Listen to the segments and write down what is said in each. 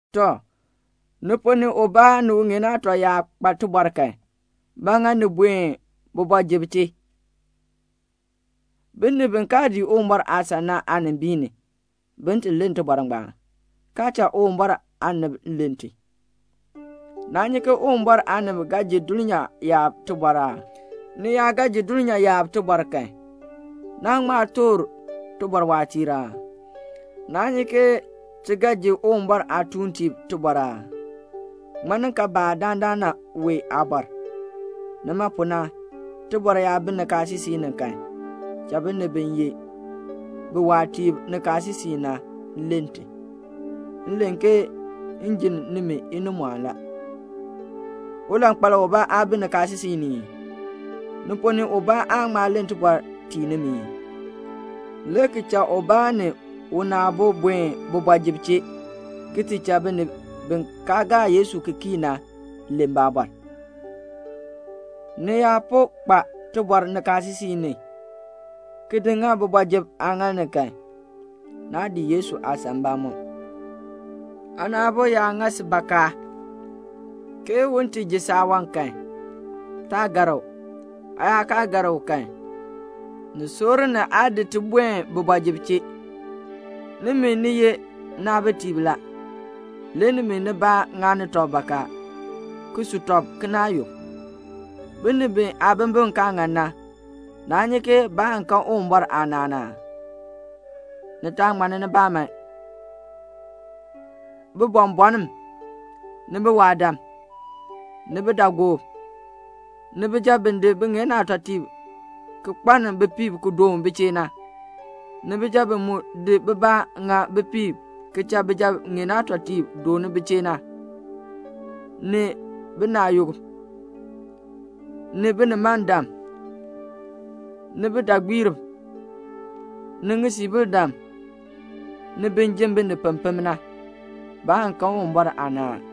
Tɔ, ni ponn ni ubaa ni uŋeen aatɔ yaa kpa tibɔr kan, ba ŋa ni buen kooti ni, binib bi kaa dii Uwumbɔr aasan na aanimbiin ni, bin ti len tibɔr ngbaan, kaa cha Uwumbɔr aanib len ti? Naa nyi ke Uwumbɔr aanib ga ji dulnyaa yaab tibɔr aa? Ni yaa ga ji dulnyaa yaab tibɔr kan, naa ŋma toor tibɔr waatiir aa? Naa nyi ke ti ga ji Uwumbɔr aatuuntiib tibɔr aa? Ŋmaninkaabaa dandana wee aabɔr? Nima pu na, tibɔr yaa bi nikaasisik ni kan, cha binib bi ye biwaatiib nikaasisik ni na len ti. M len ke m jinn nimi inimɔɔn la. Ulankpal ubaa aa bi nikaasisik ni ii? Ni ponn ni ubaa aan ŋma len tibɔr tii nimi ii? le ki cha ubaa ni una aabo buen kooti ni, ki ti cha binib bi kaa gaa Yesu ki kii na len baabɔr. Ni yaa po kpa tibɔr nikaasisik ni, ki di ŋa kooti ni kan, naa dii Yesu aasan mbamɔm. Aana aabo yaa ŋa si bakaa, ke u ti ji saawan kan, taa gar u. Aa yaa kaa gar u kan, ni soor ni aa di ti buen kooti ni. Nimi, ni ye naabitiib la; le nimi nibaa ŋani tɔb bakaa, ki su tɔb kinaayuk. Binib bi aabimbin kaa ŋan na, naa nyi ke baan kan Uwumbɔr aanaan aa? Ni taa ŋmanni nibaa man; bibɔnbɔnn, ni biwaadam, ni bidaagoob, ni bijab bi di biŋeen aatɔtiib ki kpaln bipiib ki doon bi chee na, ni bijab bi mu di bibaa ŋa bipiib ki cha bijab ŋeen aatɔtiib doon bi chee na, ni binaayukb, ni binimandam, ni bidaagbiirb, ni ŋisiibildam, ni bin ji binib pempem na, baan kan Uwumbɔr aanaan.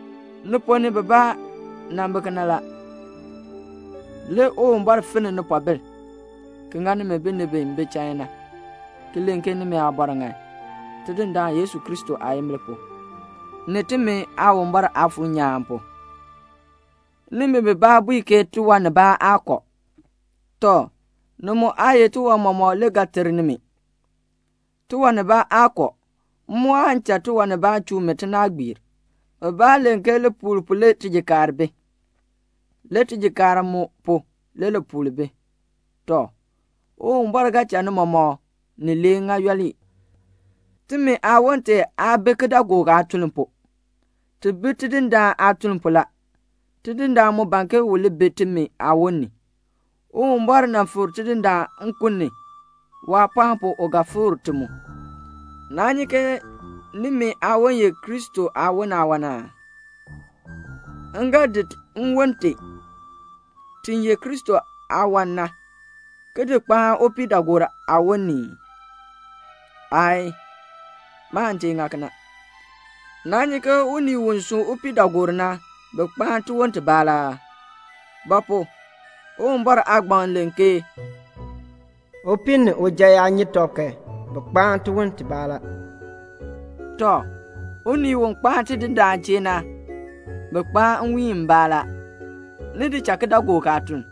Ni ponn ni bibaa nan bi kena la; le Uwumbɔr finn nipoobil, ki ŋa nimi binib bi bi chain na, ki len ke nimi aabɔr ŋan, Tidindaan Yesu Kristo aayimbil pu, ni timi Aawumbɔr Aafuur nyaan pu. Nimi bibaa bui ke tiwan nibaa aa kɔ. Tɔ, ni mu aa ye tiwan mɔmɔk le ga ter nimi. Tiwan nibaa aa kɔ; m mu aan cha tiwan nibaa chuu mi tinaagbiir. Bibaa len ke lipuul pu le tijikaar bi, le tijikaar mu pu, le lipuul bi. Tɔ, Uwumbɔr ga cha ni mɔmɔk nilee ŋa yooli. Timi aawon tee aa bi kidaagook aatuln pu, ti bi Tidindaan aatuln pu la. Tidindaan mu ban ke u li bi timi aawon ni. Uwumbɔr nan fikr Tidindaan nkun ni. Waapɔɔn pu u ga fikr ti mu. Naa nyi ke nimi aawon ye Kristo aawon aawan aa? M ga di nwon tee, ti ye Kristo aawan na, ki di kpaan upiidaagoor aawon ni ii? Aayii. Maan tee ŋa kena. Naa nyi ke unii u sun upiidaagoor na, bi kpaan tiwon tibaa la aa? Ba pu? Uwumbɔr aagbaŋ len ke "Upii ni uja yaa nyi tɔb kan, bi kpaa tiwon tibaa la." Tɔ, unii u kpaan Tidindaan chee na, bi kpaan nwiin mbaa la. Ni di cha kidaagook aatuln.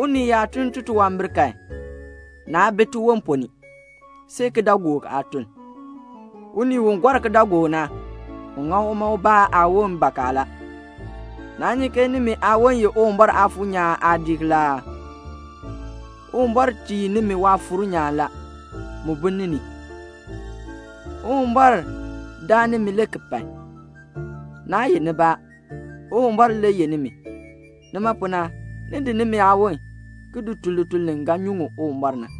Unii yaa tun titunwambir kan, naa bi tiwon ponn ni, see kidaagook aatuln. Unii u gɔr kidaagook na, u ŋa uma ubaa aawon bakaa la. Naa nyi ke nimi aawon ye Uwumbɔr Aafuur nyaan aadiik la aa? Uwumbɔr tii nimi Waafuur nyaan la. Mu bi ni ni. Uwumbɔr daa nimi le ki pai. Naa yeh nibaa, Uwumbɔr le yeh nimi. Nima pu na, ni di nimi aawon ki tun lituln li ga nyuŋ Uwumbɔr na.